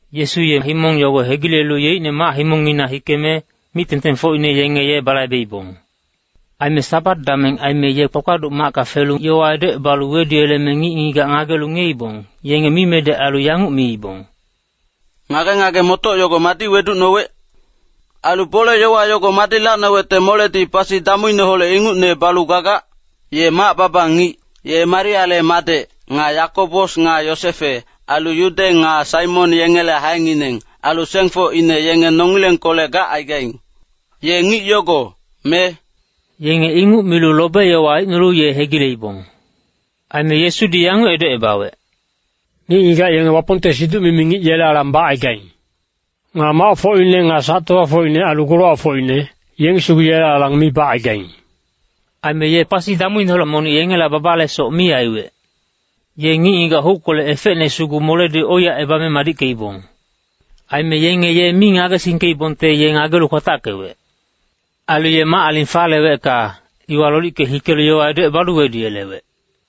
Yesu ye himong yogo hegilelu yeicne mac-himongngina hikeme, mic-tengtengfocine yenge ye balaibeibong. Aime Sabat dameng aime ye kpakpaduc macka felu yowa edocebalu weduyeleme ngic-ngigac ngagelu ngiyeibong, yenge mimedec ailu yanguc miibong, “Ngage-ngage-motoc yogo madi weducnowec? Ailu bole-yowa yogo madi lacnowecte moledi pasi damuineholec ingucne balu gagac? Ye mac-baba ngic. Ye Mariale madec, nga Yakobos nga Yosefe, ailu Yude nga Saimon yengele haengineng, ailu sengfocine yenge nongilengkolec gacaigaing. Ye ngic yogo, me?” Yenge inguc milu lobe-yowa aicnolu ye hegileibong. Aime Yesudi yanguc edocebawec, “Ngic-ngigac yenge Wapongte siduc-mimi ngic yele alang bacaigaing. Nga macfocine nga sac-tofafocine ailu golowacfocine, yengi sugu yele alang mi bacaigaing.” Aime ye pasi damuineholec monic yengela babalesoc mi aiwec. Ye ngic-ngigac huckolec efecne sugu moledi oiyacebame madickeibong. Aime yenge ye mi ngagesingkeibongte ye ngagelu kwatackewec. Ailu ye mac-aling falewecka, iwa lolicke hikelu yowa edocebalu weduyelewec.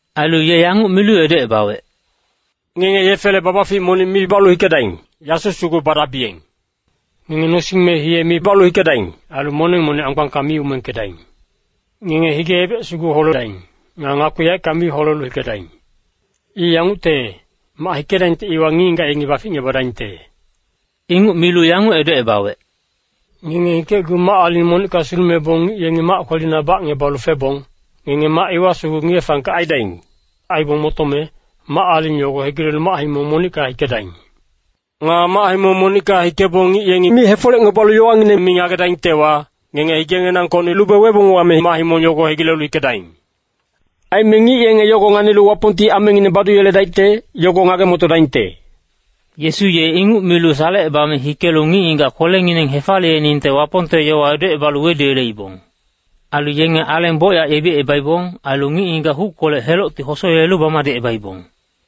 Ailu ye yanguc milu edocebawec, “Ngenge yefele babafic monic mi balu hikedaing. Yasu sugu badabiyeng. Ngenge nosing me hiye mi balu hikedaing. Ailu moneng monic anggbangka mi umengkedaing. Ngenge hige-ebec sugu holedaing. Nga ngakpi yaeckang mi holelu hikedaing. I yangucte, mac hikedabiyengte iwa ngic-ngigac yengi baficngebadaingte.” Inguc milu yanguc edocebawec, “Ngenge hikecgu mac-aling monicka sulumebong ngic yengi mac kwelina bacngebalu febong, ngenge mac iwa sugu ngiye-fangkec aidaing. Aibong motome, mac-aling yogo hegilelu mac-himong monicka hikedaing. “Nga mac-himong monicka hikebong ngic yengi mi hefolecngebalu yowangineng mi ngagedaingtewa, ngenge higenginangkocni lube webong wame mac-himong yogo hegilelu hikedaing. Aime ngic yenge yogo nganilu Wapongti amengineng baduyeledaicte, yogo ngage-motodaingte.” Yesu ye inguc milu salecebame hikelu ngic-ngigac kwelengineng hefaliyeningte Wapongte yowa edocebalu weduyeleibong. Ailu yenge aleng bocyac yebicebaibong. Ailu ngic-ngigac huckolec helocti hosoyelelu bamadicebaibong.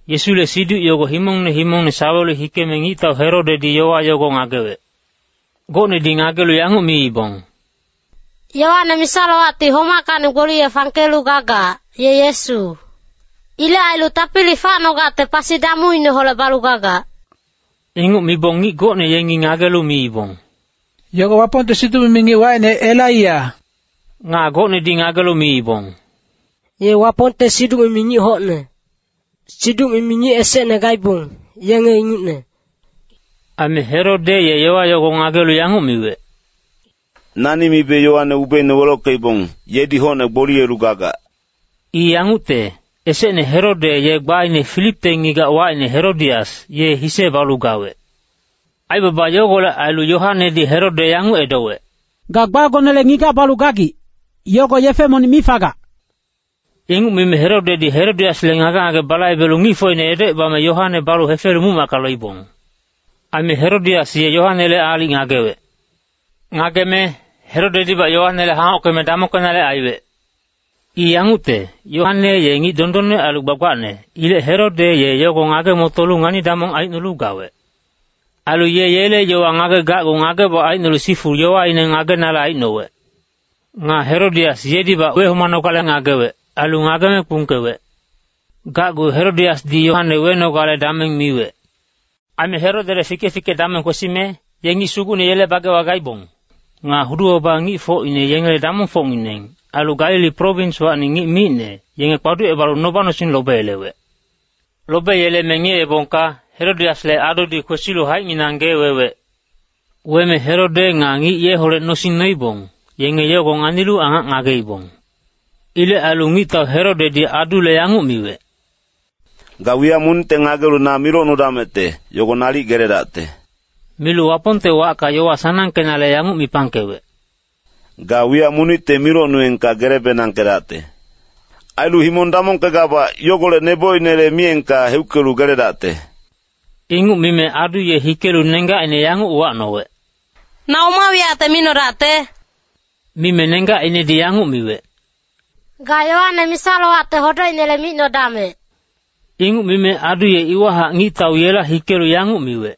Yesule siduc yogo himongne himongne sawelu hikeme ngictau Herodedi yowa yogo ngagewec. Gocnedi ngagelu yanguc miibong, “Yoane misa-lowacti homackacni gboliye fangkelu gagac, ye Yesu. Ilec ailu tapili facnogacte pasi damuineholec balu gagac.” Inguc mibong ngic gocne yengi ngagelu miibong, “Yogo Wapongte siduc-mimi ngic wacine Elaiya.” Nga gocnedi ngagelu miibong, “Ye Wapongte siduc-mimi ngic hocne. Siduc-mimi ngic esecne gaibong, yenge ingucne.” Aime Herode ye yowa yogo ngagelu yanguc miwec, “Nani mibe Yoane ubeine welockeibong, yedi hocne gboliyelu gagac.” I yangucte, esecne Herode ye gbaine Filipte ngigac wacine Herodias, ye hise balu gawec. Aibaba yogolec ailu Yoanedi Herode yanguc edowec, “Ga gbagonele ngigac balu gagic, yogo yefe monic mi fagac.” Inguc mime Herodedi Herodiasle ngage-ngage balaibelu ngicfocine edocebame, Yoane balu hefelu muc-macka loibong. Aime Herodias ye Yoanele aalic ngagewec. Ngageme, Herodedibac Yoanele hangockeme damongkenale aiwec. I yangucte, Yoane ye ngic dondonne ailu gbagbacne. Ilec Herode ye yogo ngage-motolu ngani-damong aicnolu gawec. Ailu ye yele yowa ngagegacgu ngageboc aicnolu sifu yowaine ngagenale aicnowec. Nga Herodias yedibac wehomanogale ngagewec, ailu ngageme kpungkewec. Gacgu Herodiasdi Yoane wenogale dameng miwec. Aime Herodele fike-fike dameng kwesime, ye ngic sugucne yele bagewa gaibong. Nga hudu-baba ngicfocine yengele damongfocngineng, ailu Galili prowinswacni ngic micne, yenge kpaducebalu noba-nosing lobeyelewec. Lobeyeleme ngiyeebongka, Herodiasle adudi kwesilu haicnginang gee wewec. Weme Herode nga ngic yeholec nosing noibong, yenge yogo nganilu angac ngageibong. Ilec ailu ngictau Herodedi adule yanguc miwec, “Ga wiyac monicte ngagelu na milocnudamecte, yogo nalic geledacte.” Milu Wapongte wacka yowa sanangkenale yanguc mipangkewec, “Ga wiyac monicte milocnuyengka gele-benangkedacte. Ailu himong damongkegabac, yogolec nebocinele miyengka heuckelu geledacte.” Inguc mime adu ye hikelu nenggacine yanguc uwacnowec, “Na oma wiyacte micnodacte?” Mime nenggacinedi yanguc miwec, “Ga Yoane misa-lowacte hodocinele micnodamec.” Inguc mime adu ye iwahac ngictau yela hikelu yanguc miwec,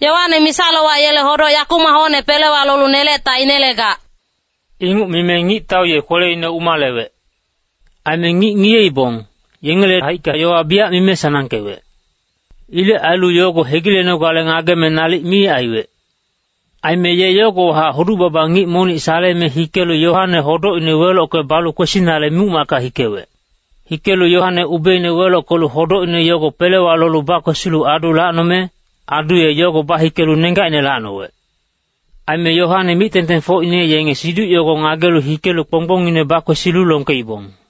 “Yoane misa-lowac yele hodoc yakumac hocne pelewa lolu nelecte ainelegac.” Inguc mime ngictau ye kweleine umalewec. Aime ngic ngiyeibong, yengele haicka yowa biyac mime sanangkewec. Ilec ailu yogo hegilenogale ngageme nalic mi aiwec. Aime ye yogowahac hudu-baba ngic monic saleme hikelu Yoane hodocine welocke balu kwesinale muc-macka hikewec. Hikelu Yoane ubeine welockelu hodocine yogo pelewa lolu bakwesilu adu lacnome, adu ye yogo bahikelu nenggacine lacnowec. Aime Yoane mic-tengtengfocine yenge siduc yogo ngagelu hikelu kponggbongine bakwesilu longkeibong.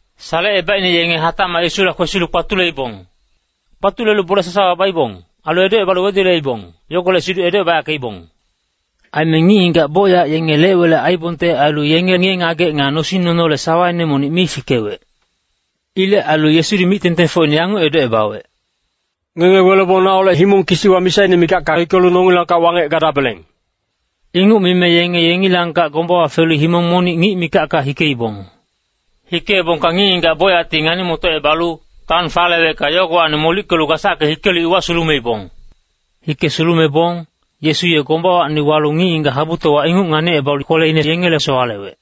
Salecebaicne yenge hatacmac Yesula kwesilu kpatuleibong. Kpatulelu bole sasawa baibong, ailu edocebalu weduyeleibong, yogolec siduc edoyackeibong. Aime ngic-ngigac bocyac yenge lec-welec aiibongte ailu, yenge ngiye-ngagec nga nosing nonole sawaine monic mi fikewec. Ilec ailu Yesudi mic-tengtengfocine yanguc edocebawec, “Ngenge welebong naholec himong kisiwa misaine mikacka hikelu nongilangkac wangec gadabeleng.” Inguc mime yenge yengilangkac gombawa felu himong monic ngic mikacka hikeibong. Hikeebongka ngic-ngigac bocyacti ngani-motocebalu, taon falewecka, yogowacni molickelu gasacke hikelu iwa sulumeibong. Hike sulumebong, Yesu ye gombawacni walu ngic-ngigac habutowa inguc nganicebalu kweleine yengele sowalewec.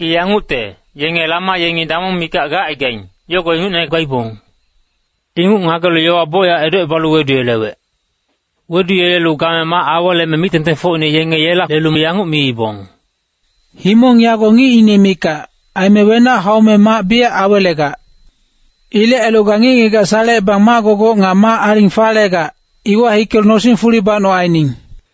I yangucte, yenge lama yengi damong mikac gacaigaing, yogo ingucne gaibong. Inguc ngagelu yowa bocyac edocebalu weduyelewec. Weduyelelu game mac aweleme mic-tengtengfocine yengi yela lelu yanguc miibong, “Himong yago ngicine mikac, aime wenac haume mac biyac awelegac. Ilec ailu ga ngic-ngigac salecebang mac-gogoc nga mac-aling falegac, iwa hikelu nosing fuli banoc aining.”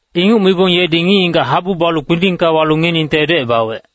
Inguc mibong yedi ngic-ngigac habu balu kpindingka walu ngiyeningte edocebawec.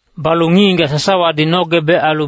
Balu ngic-ngigac sasawadi nogebec ailu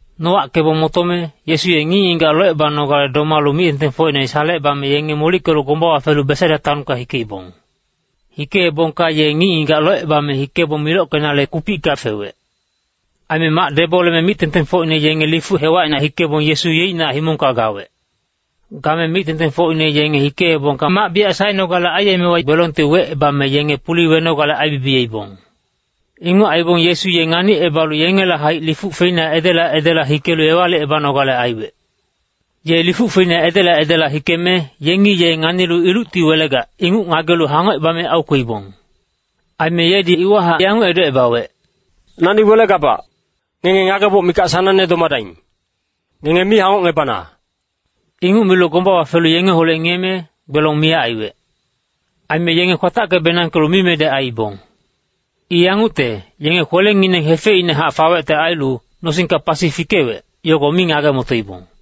Nowackebong motome, Yesu ye ngic-ngigac locebanogale domalu mic-tengtengfocine salecebame yenge molickelu gombawa felu Besaida taonka hikeibong. Hikeebongka ye ngic-ngigac locebame hikebong milockenale kupicka fewec. Aime mac deboleme mic-tengtengfocine yenge lifuc hewacina hikebong, Yesu yeicnac himongka gawec. Game mic-tengtengfocine yenge hikeebongka mac biyac saenogale aiyemewa gbelongti wecebame yenge puli wenogale aibibiyeibong. Inguc aibong Yesu ye nganicebalu yengela haic lifuc feina edela edela hikelu ewalicebanogale aiwec. Ye lifuc feina edela edela hikeme, yengi ye nganilu ilucti welegac, inguc ngagelu hangocebame aukweibong. Aime yedi iwahac yanguc edocebawec, “Nani welegabac. Ngenge ngageboc mikac sanangne domadaing. Ngenge mi hangocngebana.” Inguc milu gombawa felu yengeholec ngiyeme, gbelong miyac aiwec. Aime yenge kwatacke-benangkelu mimedec aiibong. I yangucte, yenge kwelengineng hefeicnehac fawecte ailu, nosingka pasi fikewec, yogo mi ngage-motoibong.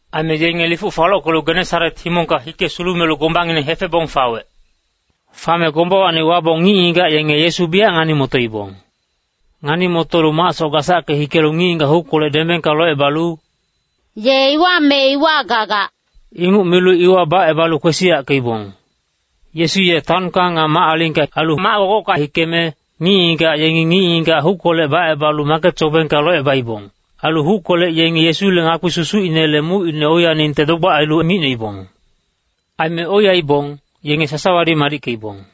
Aime yenge lifuc falockelu Genesaret himongka hike sulumelu gombangineng hefebong fawec. Fame gombawacni wabong ngic-ngigac yenge Yesu biyac ngani-motoibong. Ngani-motolu macsoc gasacke hikelu ngic-ngigac huckolec dembengka locebalu, “Ye iwa me iwa gagac,” inguc milu iwa bacebalu kwesiyackeibong. Yesu ye taonka nga mac-alingka ailu mac-gogocka hikeme, ngic-ngigac yengi ngic-ngigac huckolec bacebalu maket sobengka locebaibong. Ailu huckolec yengi Yesule ngakpi susucinele mucine oiyaningte dogbac ailu micnoibong. Aime oiyaibong, yenge sasawadi madickeibong.